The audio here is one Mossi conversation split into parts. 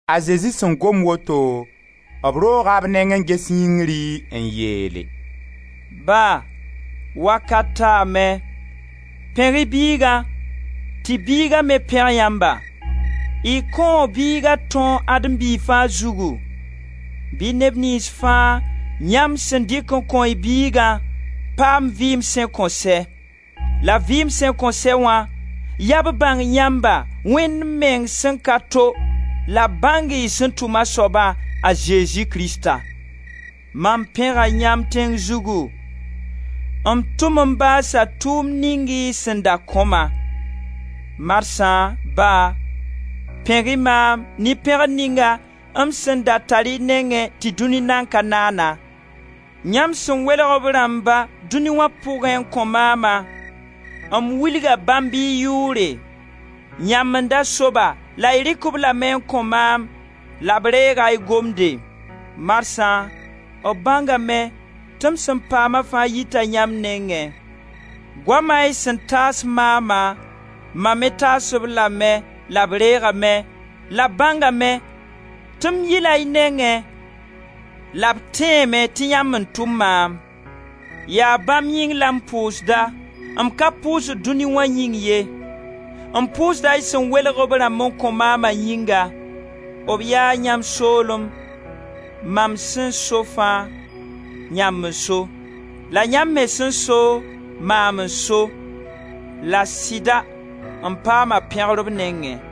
A Zezi sẽn gom woto, b rooga b neng n ges yĩngri n yeele: «Ba, wakat taame: pẽg-y Biiga tɩ y Biiga me pẽg yãmba! Y kõo Biiga tõog Adem biig fãa zugu. Bɩ neb niyns fãa yãmb sẽn dɩk n kõ y Biigã, paam vɩɩm sẽn kõn sɛ! La vɩɩm sẽn kõn sɛ wã, yaa b bãng yãmba, Wẽnd meng sẽn ka to, la b bãng y sẽn tʋm a soaba, a Zezi Krista. Mam pẽga yãmb tẽng zugu; m tʋm n baasa tʋʋmd ning y sẽn da kõ-ma. Marsã, Ba, pẽg-y maam ne pẽgr ninga m sẽn da tar y nengẽ tɩ dũni nan ka naana. Yãmb sẽn welg b rãmba dũni wã pʋgẽ n kõ maama, m wilga bãmb y yʋʋre. Yãmb n da so-ba, la y rɩk-b lame n kõ maam la b reega y gomde. Marsã b bãnga me tɩ m sẽn paama fãa yita yãmb nengẽ. Goama y sẽn taas maama, mam me taas-b lame la b reegame, la b bãngame tɩ m yila y nengẽ, la b tẽeme tɩ yãmb n tʋm maam. Yaa bãmb yĩng la m pʋʋsda, m ka pʋsd dũni wã yĩng ye. M pʋʋsda y sẽn welg b rãmb n kõ maama yĩnga. B yaa yãmb soolem, Mam sẽn so fãa, yãmb n so. La yãmb me sẽn so, maam n so. La sɩda m paama pẽgr b nengẽ.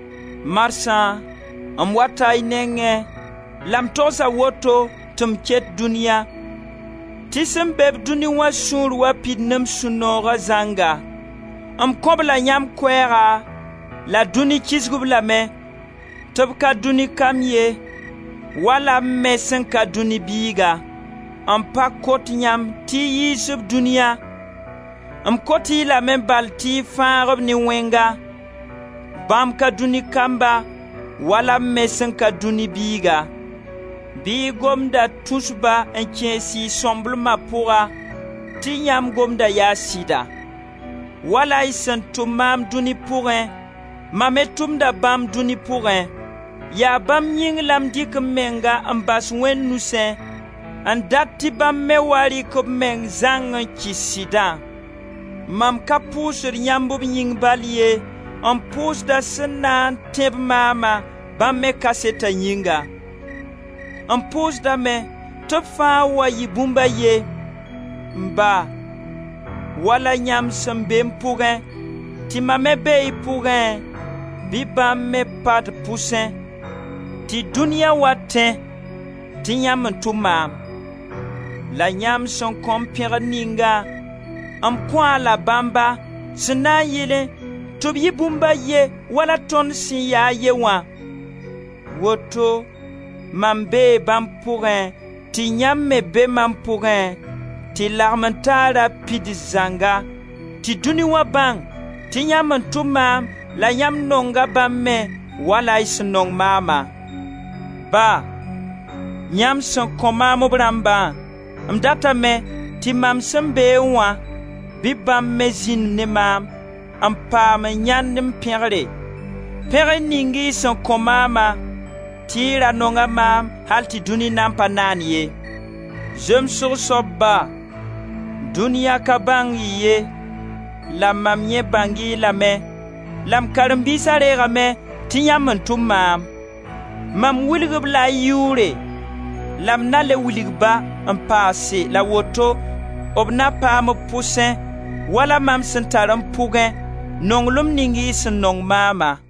Marsã m wata y nengẽ la m togsa woto tɩ m ket dũniya tɩ sẽn be-b dũni wã sũur wa pid ne m sũ-nooga zãnga. M kõ-b la yãmb koɛɛga la dũni kisg-b lame tɩ b ka dũni kamb ye, wala m me sẽn ka dũni biiga. M pa kot yãmb tɩ y yiis-b dũniya, m kot-y lame bal tɩ y fãag-b ne Wẽnga. Bãmb ka dũni kamba wala m me sẽn ka dũni biiga. Bɩ y gomda tus-ba n kẽes y sõmblema pʋga tɩ yãmb gomda yaa sɩda. Wala y sẽn tʋm maam dũni pʋgẽ mam me tʋmda bãmb dũni pʋgẽ. Yaa bãmb yĩng la m dɩk m menga n bas Wẽnd nusẽ n dat tɩ bãmb me wa rɩk b meng zãng n kɩs Sɩdã. Mam ka pʋʋsd yãmb b yĩng bal ye, m pʋʋsda sẽn na n tẽ-b maama bãmb me kaseta yĩnga. M pʋʋsdame tɩ b fãa wa yɩ bũmb a ye. M Ba, wala yãmb sẽn be m pʋgẽ tɩ mam me bee y pʋgẽ, bɩ bãmb me pa d pʋsẽ, tɩ dũniya wa tẽ tɩ yãmb n tʋm maam. La yãmb sẽn kõ-m pẽgr ningã m kõ-a la bãmba, sẽn na yɩlẽ tɩ b yɩ bũmb a ye wala tõnd sẽn ya a ye wã. Woto mam bee bãmb pʋgẽ, tɩ yãmb me bee mam pʋgẽ tɩ lagmen-taara pids zãnga, tɩ dũni wã bãng tɩ yãmb n tʋm maam la yãmb nonga bãmb me, wala y sẽn nong maama. Ba, yãmb sẽn kõ maam b rãmbã, m datame tɩ mam sẽn beẽ wã, bɩ bãmb me zĩnd ne maam, n paam n yãend m pẽgre, pẽgr ning y sẽn kõ maama, tɩ y ra nonga maam al tɩ dũni nan pa naan ye. Zemsgo soab, Ba, dũniya ka bãng-y ye, la mam yẽ bãng-y lame la m karen-biisa reegame tɩ yãmb n tʋm maam. Mam wilg-b la y yʋʋre, la m na le wilg-ba, n paase la woto b na paam b pʋsẽ, wala mam sẽn tar m pʋgẽ, nonglem ning y sẽn nong maama.»